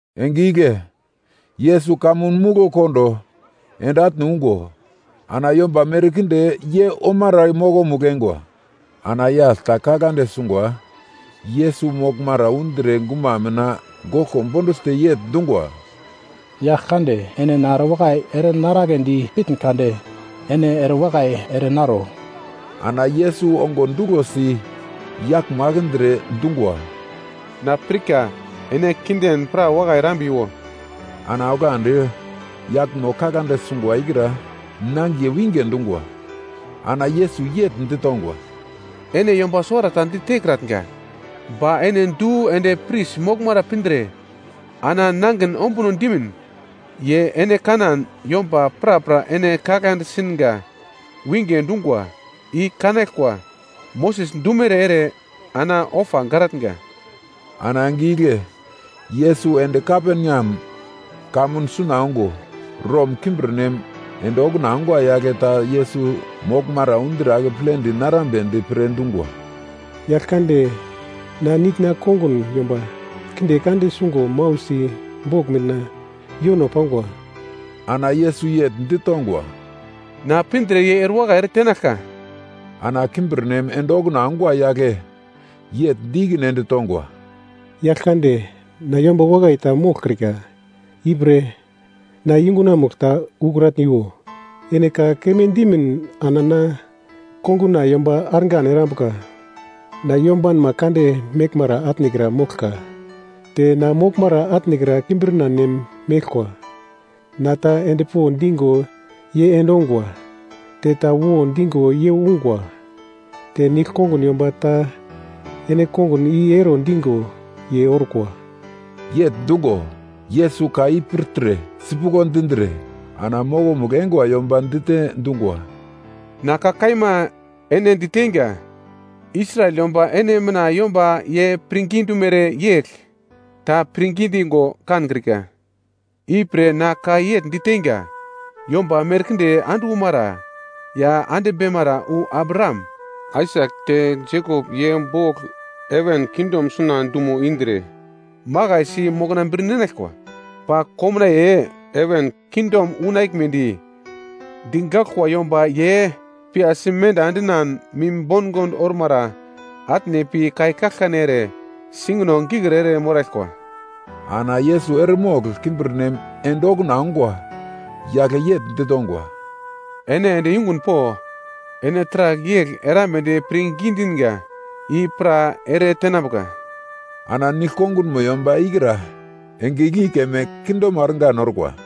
Enge igle Yesus kamun muglo kondo ende atne ungo, ana yomba merkinde ye omara mokomugl eingwa. Ana yagl ta kaglande sungwa Yesus moglmara undre guma mina goglko bonduglte yegl dungwa, “Yaglkande, ene na erewakai ere naraglendi pitn kade, ene erewakai ere naro.” Ana Yesus ongo duglosi yaglmo akindre dungwa, “Na pirka, ene kinden pra wakai erambiwo.” Ana oglandi yaglmo kaglande sungwa ikra nangiye winge dungwa. Ana Yesus yegl ditongwa, “Ene yomba suwarata ditekratnga, ba ene du ende pris moglmara pindre ana nangin ombuno dimin. Ye ene kanan, yomba prapra ene kaglande singa winge dungwa i kanaglkwa, Moses dumere ere ana ofa garatnga.” Ana enge igle Yesus ende Kaperneam kamun suna ongo, Rom kimbirnem ende okuna ongwa yagle ta Yesus moglmara undre akepledi narambedi pre dungwa, “Yaglkande, na nitna konguna yomba kinde kande sungo mau si bogl mina yono pangwa.” Ana Yesus yegl ditongwa, “Na pindre ye erewakai ere tenaglka.” Ana kimbirnem ende okuna ongwa yagle yegl di ikine ende tongwa, “Yaglkande, na yomba wakai ta moglkrika, ipre na yungunamugl ta ukratniwo. Ene ka keme dimin ana na konguna yomba argan erambuka. Na yombanma kande meglmara atnekra moglka. Te na moglmara atnekra kimbirna nem meglkwa. Na ta endpo digo ye endongwa. Te ta wo digo ye ungwa, te nigl konguna yomba ta ene kongun i ero digo, ye orkwa.” Yegl dungo, Yesus ka i pirtre sipuglo dindre ana mokomugl eingwa yomba dite dungwa, “Na ka kaima ene diteinga, Israel yomba ene mina yomba ye pirngi dumere yegl ta pirngi digo kankrika. Ipre na ka yegl diteinga, yomba merkinde ande umara ya beimara wu Abraham, Aisak te Jekop ye bogl heven kingdom suna dumo indre makaisi mokna bir ninaglkwa. Ba komnaiye heven kingdom unaglmedi, digaglkwa yomba ye piyasi menda endinan mim bongond ormara, atne pi kai kaglkane ere singino gikir ere moraglkwa.” Ana Yesus eremogl kimbirnem ende okuna ongwa yagle yegl ditongwa, “Ene ende yungun po! Ene taragl yegl erambedi pirngi dinga i pra ere tenambuka.” Ana nigl kongunmo yomba ikra enge igle keme kindemo argan orkwa.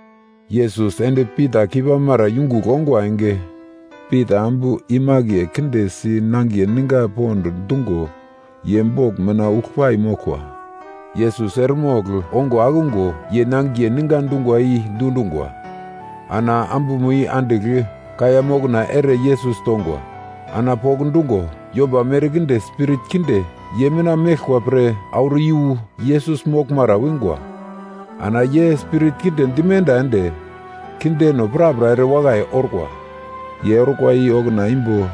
Yesus ende Pita keipamara yungugl ongwa enge, Pita ambu imake kinde si nangiye ninga pond dungo ye bogl mina uglpai moglkwa. Yesus eremogl ongo akungo ye nangiye ninga dungwa i dundungwa, ana ambumo andigl kaiya mokna ere Yesus tongwa. Ana pokndungo, yomba merkinde spirit kinde ye mina meglkwa pre, auro iyu Yesus moglmara wingwa. Ana ye spirit kinde dimenda ende, kindeno prapra erewakai orkwa. Ye orkwa i okuna imbo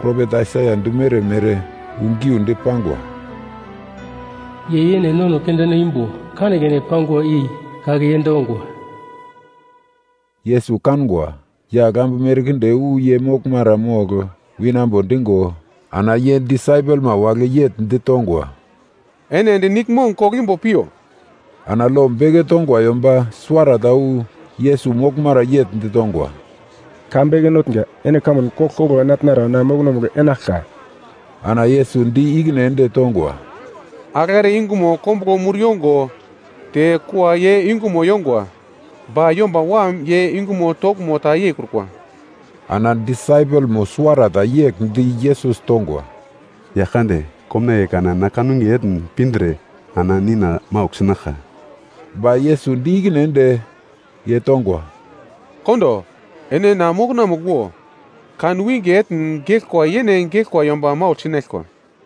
propet Aisaia dumere mere wu geundi pangwa: “Ye yene nono kindeno imbo kanekane pangwa i kake yend ongwa.” Yesus kangwa, yagl ambu merkinde wu ye moglmara mogl winambo digo ana ye disaipelma wagle yegl ditongwa, “Ene ende niglmong koglo imbo piyo.” Ana lo beke tongwa yomba suwarata wu Yesus moglmara yegl ditongwa, “Ka Beke Notnga, ene kamun koglkoglo enatnara na mokonomugl enaglka.” Ana Yesus di ikine ende tongwa, “Agl are yungumo kombuglo mur yongo, te kua ye yungumo yongwa, ba Yomba Wam ye yungumo toglmo ta yeikrukwa.” Ana disaipelmo suwarata yegl di Yesus tongwa, “Yaglkande, komnaiye kana na kanwinge etn pindre ana nina maugl sinaglka.” Ba Yesus di ikine ende ye tongwa, “Kondo ene na mokonamugl wo. Kanwinge etn geglkwa yene geglkwa yomba maugl sinaglkwa.”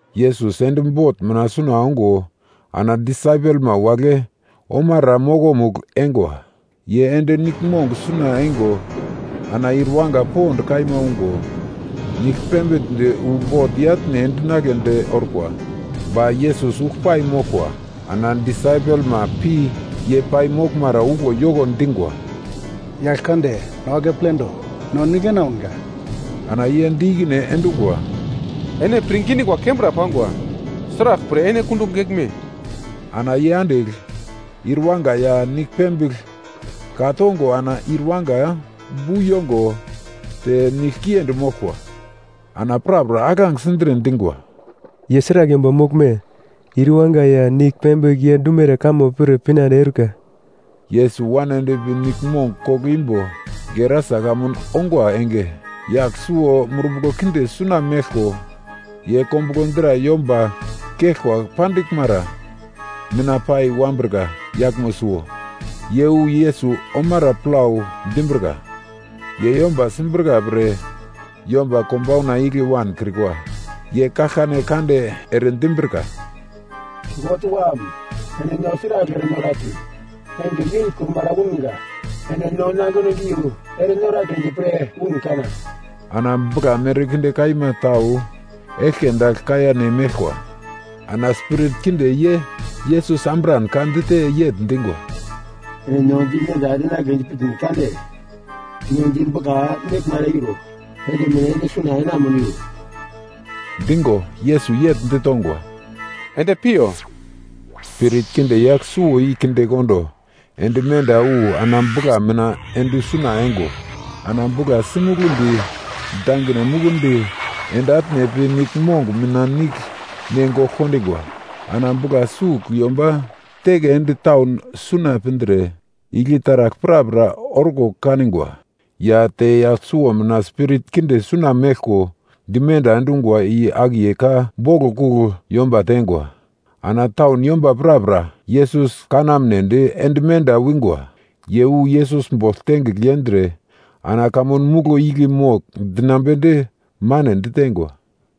Yesus ende bot mina suna ongo ana disaipelma wagle omara mokomugl eingwa. Ye ende niglmong suna eingo ana ir yuwanga pond kaima ungo, nigl pembigldi wu bot i-atne endinagledi orkwa. Ba Yesus uglpai moglkwa. Ana disaipelma pi ye pai moglmara uglo yoko dingwa, “Yaglkande, no akepledo, no nigl enaunga!” Ana ye di ikine endungwa, “Ene pirngi dingwa kembra pangwa. Sraglpre ene kundugl geglme?” Ana ye andigl ir yuwanga ya nigl pembigl ka tongo ana ir yuwanga bu yongo te nigl kiendi moglkwa. Ana prapra alagl sindre dingwa, “Ye sragl yomba moglme? Ir yuwanga ya nigl pembigl ye dumere kamo pir pinande eurika.” Yesus wan endpi niglmong koglo imbo Gerasa kamun ongwa enge, yagl suwo spirit kinde suna meglko, ye kombuglo dra yomba geglko pandiglmara mina pai wanbrika yaglmo suwo, ye wu Yesus omara plau dimbrika. Ye yomba simbrika pre yomba konbauna igle wankrikwa. Ye kaglkane kande ere dimbrika, “God Wam, ene no sragl ere noratn? Enge yeikrumara unga, ene no nangino giu ere noragledi pre un kana?” Ana bugla merkinde kaima tau eglke dagl kaiya ne meglkwa. Ana spirit kinde ye Yesus ambran ka dite yegl dingwa, “Ene no dimenda endinagledi pitn kade, no di bugla meglmara iro endimin ende suna enamuniwo.” Digo, Yesus yegl ditongwa, “Ende piyo!” Spirit kinde yagl suwo i kindekondo ende menda wu ana bugla mina ende suna eingo, ana bugla sinuglundi dangine mukundi ende atne pi niglmong mina nigl ne gogl kondingwa. Ana bugla sugl yomba teke ende taun suna pindre, igle taragl prapra orko kanigwa, ya te yagl suwo mina spirit kinde suna meglko dimenda endungwa i akiye ka boglo kugl yomba teingwa. Ana taun yomba prapra Yesus kanamnedi ende menda wingwa. Ye wu Yesus bogl tengigl yendre ana kamunomugl igle mogl dinambedi mane ditengwa.